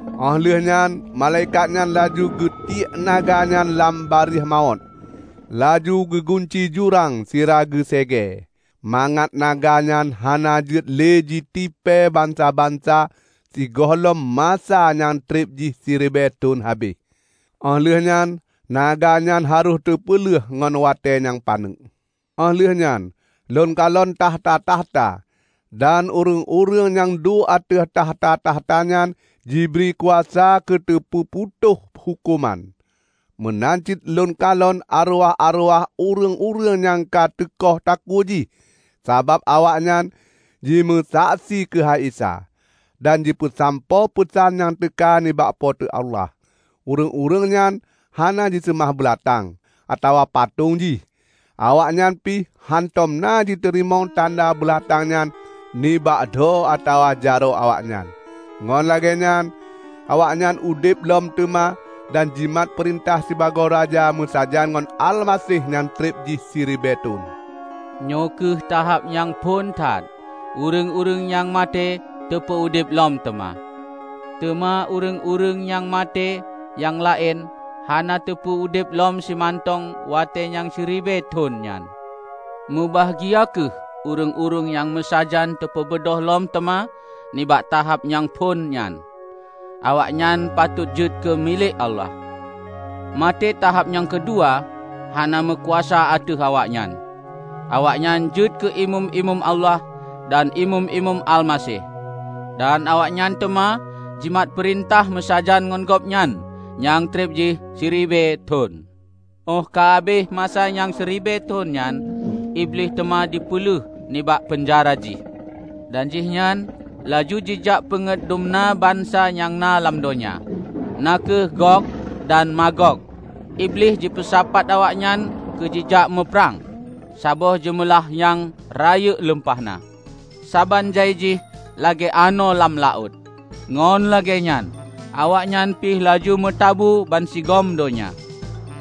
Óh lheueh nyan malaikat nyan laju geutiek naga nyan lam barieh mawöt, laju geugunci jurang sira geu séegée, mangat naga nyan hana jeuet lé jitipée bansa-bansa sigohlom masa nyang treb jih siribée thon habéh. Óh lheueh nyan naga nyan harôh teupeuleuh ngon watée nyang paneuk. Óh lheueh nyan lôn kalon takhta-takhta, dan ureuëng-ureuëng nyang duek ateueh takhta-takhta nyan jibri kuasa keuteupeuputôh huköman. Meunan cit na lôn kalon areuwah-areuwah ureuëng-ureuëng nyang ka teukoh takue jih sabab awaknyan jimeusaksi keuhai Isa, dan jipeusampoe peusan nyang teuka nibak Po teu Allah. Ureuëng-ureuëng nyan hana jiseumah beulatang, atawa patong jih. Awaknyan pih hántom na jiteurimong tanda beulatang nyan nibak dho atawa jaroe awaknyan. Ngon lagée nyan awaknyan udeb lom teuma dan jimat peurintah sibagoe raja meusajan ngon Almaseh nyang treb jih siribée thon. Nyoe kheueh tahab nyang phon that ureuëng-ureuëng nyang maté teupeu udeb lom teuma. (Teuma ureuëng-ureuëng nyang maté nyang laén hana teupeu udeb lom simantong watée nyang siribée thon nyan.) Mubahgia kheueh ureuëng-ureuëng nyang meusajan teupeubeudôh lom teuma nibak tahab nyang phon nyan. Awaknyan patot jeuet keu milék Allah. Maté tahab nyang keudua hana meukuasa ateueh awaknyan. Awaknyan jeuet keu imeum-imeum Allah dan imeum-imeum Almaseh; dan awaknyan teuma jimat peurintah meusajan ngon Gobnyan nyang treb jih siribée thon. Óh ka habéh masa nyang siribée thon nyan, Iblih teuma teupeuleuh nibak peunjara jih, dan jihnyan laju jijak peungét dumna bansa nyang na lam donya, na kheueh Gog dan Magog. Iblih jipeusapat awaknyan keu jijak muprang, saboh jeumeulah nyang rayeuk lumpah na, saban jai jih lagée anoe lam laôt. Ngon lagée nyan awaknyan pih laju meutabu bansigom donya,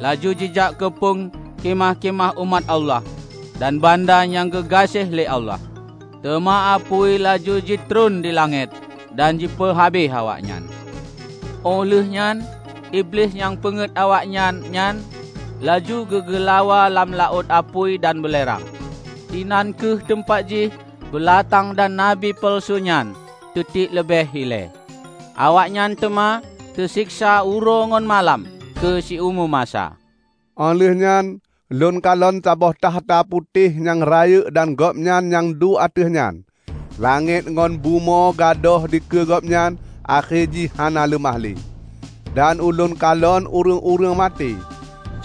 laju jijak keupong khimah-khimah umat Allah dan banda nyang geugaséh lé Allah. Teuma apui laju jitreun di langét dan jipeu habéh awaknyan. Óh lheueh nyan Iblih nyang peungéut awaknyan nyan, laju geu-geulawa lam laôt apui dan beulerang. Inan kheueh teumpat jih beulatang dan nabi peuleusu nyan teutiek leubeh ilée. Awaknyan teuma teuseksa uroe ngon malam keu siumu masa. Óh lheueh nyan ulôn kalon saboh takhta putéh nyang rayeuk dan Gobnyan nyang duek ateueh nyan. Langét ngon bumoe gadôh dikeue Gobnyan, akhé jih hana leumah lé. Dan ulôn kalon ureuëng-ureuëng maté,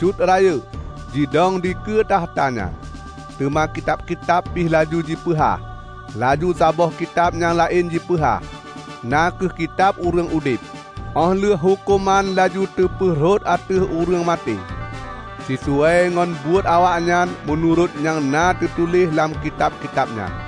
cut rayeuk, jidong dikeue takhta nyan. Teuma kitab-kitab pih laju jipeuhah. Laju saboh kitab nyang laén jipeuhah, na kheueh Kitab Ureuëng Udeb. Óh lheueh huköman laju teupeurhot ateueh ureuëng maté, sisuai ngon buet awaknyan meunurot nyang na teutuléh lam kitab-kitab nyan.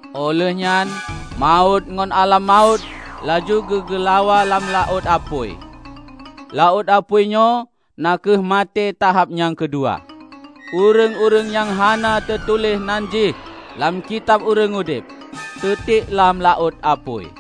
Óh lheueh nyan Mawöt ngon Alam Mawöt laju geu-geulawa lam laôt apui. (Laôt apui nyoe na kheueh maté tahab nyang keudua.) Ureuëng-ureuëng nyang hana teutuléh nan jih lam Kitab Ureuëng Udeb, teutiek lam laôt apui.